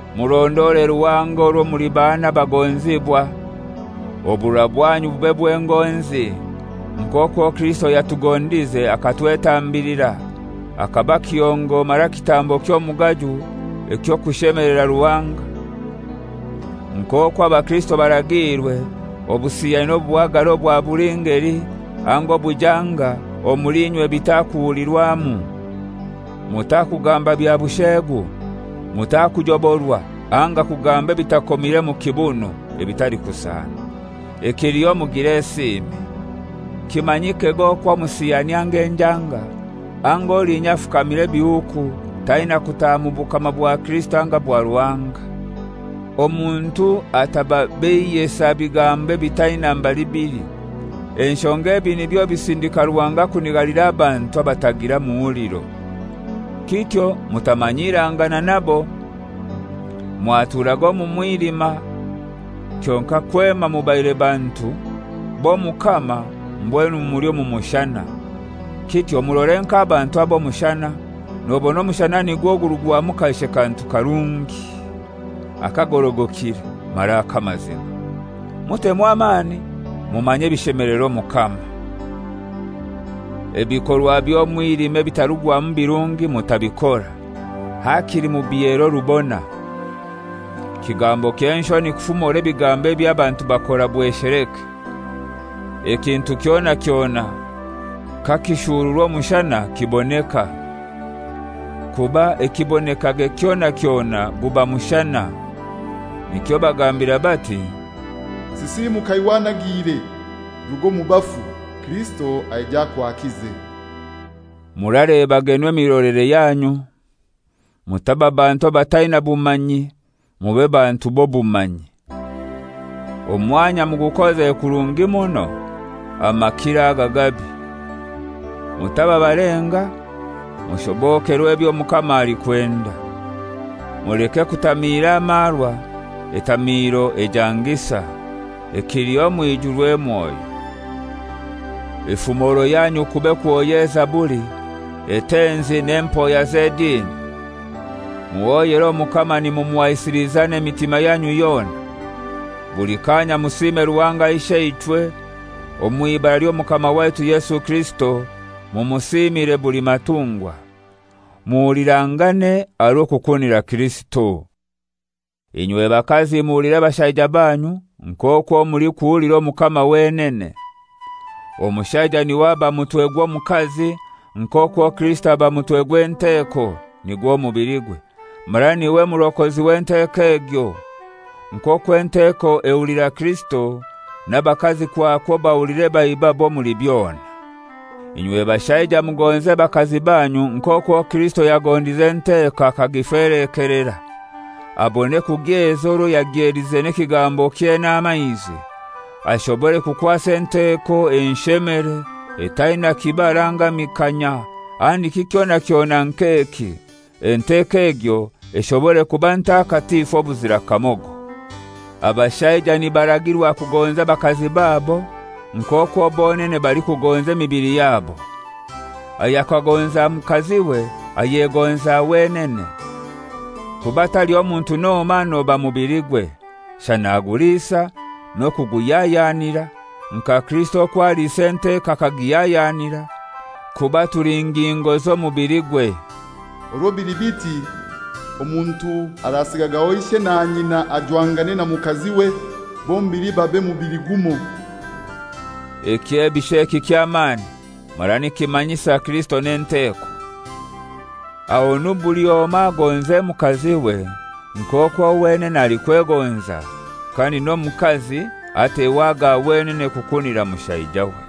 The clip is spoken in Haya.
Murondore Ruhanga orwo muli bana abagonzibwa. Oburora bwanyu bube bw'engonzi, nk'okwo Kirisito yatugondize akatwetambilira, akaba kihongo mara kitambo ky'omugaju eky'okushemelera Ruhanga. Nk'okwo abakirisito baragiirwe, obusiyani n'obuhagare obwa buli ngeli anga obujanga omuli inywe bitakuhulirwamu. Mutakugamba bya busheegu, mutakujoborwa anga kugamba ebitakomire mu kibunu, ebitalikusana. Ekiliho mugire esiimi. Kimanyikege okwo omusiyani anga enjanga, anga olinya afukamira ebihuku taina kutaha mu bukama bwa Kirisito anga bwa Ruhanga. Omuntu atababeiyesa bigambo ebitaina mbali bili, enshonga ebi nibyo bisindika Ruhanga kunigalira abantu abatagira muhuliro. Kityo mutamanyirangana nabo. Mwaturaga omu mwilima, kyonkai kwema mubaire bantu b'Omukama mbwenu muli omu mushana. Kityo murore nk'abantu ab'omushana, nobona omushana nigwo gurugwamu kaishe kantu akarungi, akagorogokire mara ak'amazima. Mutemu amani mumanye ebishemelera Omukama. Ebikorwa by'omwilima ebitarugwamu birungi mutabikora; hakili mubihere orubona. Kigambo ky'enshoni kufumora ebigambo eby'abantu bakora bwesheleke. Ekintu kyona kyona kakishururwa omushana kiboneka, kuba ekibonekage kyona kyona guba mushana. Nikyo bagambira bati, «Sisimuka iwe anagiire, ruga omu bafu; Kirisito aije akwakize.» Muralebagenu emirolere yanyu; mutaba bantu abataina bumanyi, mube bantu b'obumanyi. Omwanya mugukoze kurungi muno, amakiro aga gabi. Mutaba balenga, mushobokerwe ebyo Omukama alikwenda. Muleke kutamiira amarwa, etamiiro ejangisa. Ekiliho mwijurwe Mwoyo. Efumoro yanyu kube kuhoya ezaburi, etenzi n'empoya z'edini, muhoyere Omukama nimumuhaisiliza n'emitima yanyu yona. Buli kanya musiime Ruhanga Isheichwe omw'ibara ly'Omukama waitu Yesu Kirisito, mumusiimire buli matungwa. Muhulirangane aha rw'okukunira Kirisito. Inywe bakazi muhulire bashaija banyu, nk'okwo mulikuhulira Omukama wenene. Omushaija n'iwe aba mutwe gw'omukazi, nk'okwo Kirisito aba mutwe gw'enteko, nigwo mubiligwe, mara n'iwe murokozi w'enteko egyo. Nk'okwo enteko ehulira Kirisito, n'abakazi kwakwo bahulire baibabo omuli byona. Inywe bashaija mugonze bakazi banyu nk'okwo Kirisito yagondize enteko akagifelekelera, abone kugyeza orwo yagyelize n'ekigambokye n'amaizi; ashobore kukwasa enteko enshemere, etaina kibara anga mikanya, handiki kyona kyona nk'eki, enteko egyo eshobore kuba ntakatifu obuzira kamogo. Abashaija nibaragirwa kugonza abakazi babo nk'okwo bonene balikugonza emibili yabo. Ayakagonza mukaziwe ayegonza wenene. Kuba taliho muntu n'omoi anoba mubiligwe, shana aguliisa n'okuguhyahyanira, nka Kirisito okwo aliisa enteko akagihyahyanira, kuba tuli ngingo z'omubiligwe. Orwo bili biti, omuntu arasigagaho ishe na nyina ajwangane na mukaziwe, bombili babe mubili gumoi. Ekyebisho eki ky'amani, mara nikimanyisa Kirisito n'enteko. Ahonu buli omoi agonze mukaziwe nk'okwo wenene alikwegonza, kandi n'omukazi ateho aga wenene kukunira mushaijawe.